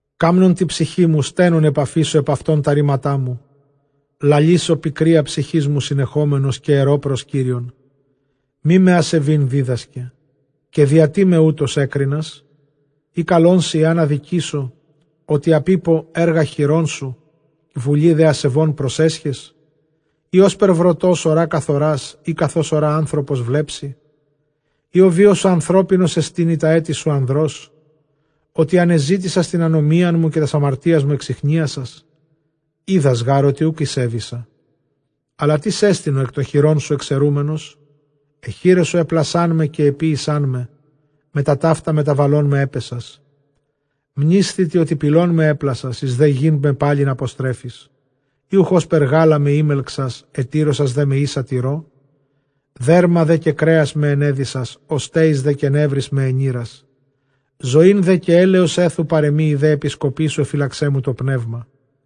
Καμνὼν τῇ ψυχῇ μου, στένων ἐπαφήσω ἐπʼ αὐτὸν τὰ ῥήματα μου· λαλήσω πικρίᾳ ψυχῆς μου συνεχόμενος, καὶ ἐρῶ πρὸς Κύριον, μή με ἀσεβεῖν δίδασκε· καὶ διατί με οὕτως ἔκρινας; Ἢ καλόν σοι ἐὰν ἀδικήσω; ὅτι ἀπείπω ἔργα χειρῶν σου, βουλῇ δὲ ἀσεβῶν προσέσχες. Ἢ ὥσπερ βροτὸς ὁρᾷ, καθορᾷς; ἢ καθὼς ὁρᾷ ἄνθρωπος, βλέψῃ; Ἢ ὁ βίος σου ἀνθρώπινός ἐστιν, ἢ τὰ ἔτη σου ἀνδρὸς, ὅτι ἀνεζήτησας τὴν ἀνομίαν μου, καὶ τὰς ἁμαρτίας μου ἐξιχνίασας; Οἶδας γὰρ ὅτι οὐκ ἠσέβησα· ἀλλὰ τίς ἐστιν ὁ ἐκ τῶν χειρῶν σου ἐξαιρούμενος; Αἱ χεῖρές σου ἔπλασάν με καὶ ἐποίησάν με, μετὰ ταῦτα μεταβαλών με ἔπαισας. Μνήσθητι, ὅτι πηλόν με ἔπλασας, εἰς δὲ γῆν με πάλιν ἀποστρέφεις. Ἢ οὐχ ὥσπερ γάλα με ἤμελξας, ἐτύρωσας δέ με ἶσα τυρῷ; Δέρμα δὲ καὶ κρέας με ἐνέδυσας, ὀστέοις δὲ καὶ νεύροις με ἔνειρας. Ζωὴν δὲ καὶ ἔλεος ἔθου παρʼ ἐμοὶ, ἡ δὲ ἐπισκοπή σου ἐφυλαξέ μου τὸ πνεῦμα.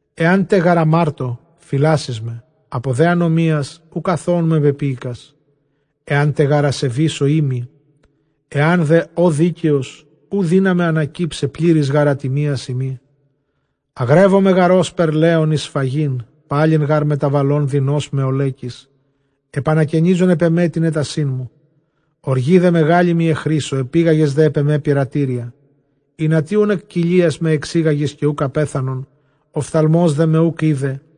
Ἐάν τε γὰρ ἁμάρτω, φυλάσσεις με, ἀπὸ δὲ ἀνομίας οὐκ ἀθῶόν με πεποίηκας. Ἐάν τε γὰρ ἀσεβήσω, οἴμοι· ἐὰν δὲ ὦ δίκαιος, οὐ δύναμαι ἀνακύψαι, πλήρης γὰρ ἀτιμίας εἰμί. Ἀγρεύομαι γὰρ ὥσπερ λέων εἰς σφαγήν· πάλιν γὰρ μεταβαλὼν δεινῶς με ὀλέκεις, ἐπανακαινίζων ἐπʼ ἐμὲ τὴν ἔτασίν μου· ὀργῇ δὲ μεγάλῃ μοι ἐχρήσω, ἐπήγαγες δὲ ἐπʼ ἐμὲ πειρατήρια. Ἱνατί οὖν ἐκ κοιλίας με ἐξήγαγες, καὶ οὐκ ἀπέθανον, ὀφθαλμὸς δέ με οὐκ εἶδε,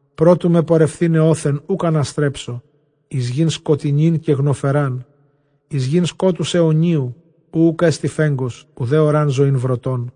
πρὸ τοῦ με πορευθῆναι ὅθεν οὐκ ἀναστρέψω, εἰς γῆν σκοτεινὴν καὶ γνοφερὰν, εἰς γῆν σκότους αἰωνίου, οὗ οὐκ ἔστι φέγγος, οὐδὲ ὁρᾷν ζωὴν βροτῶν.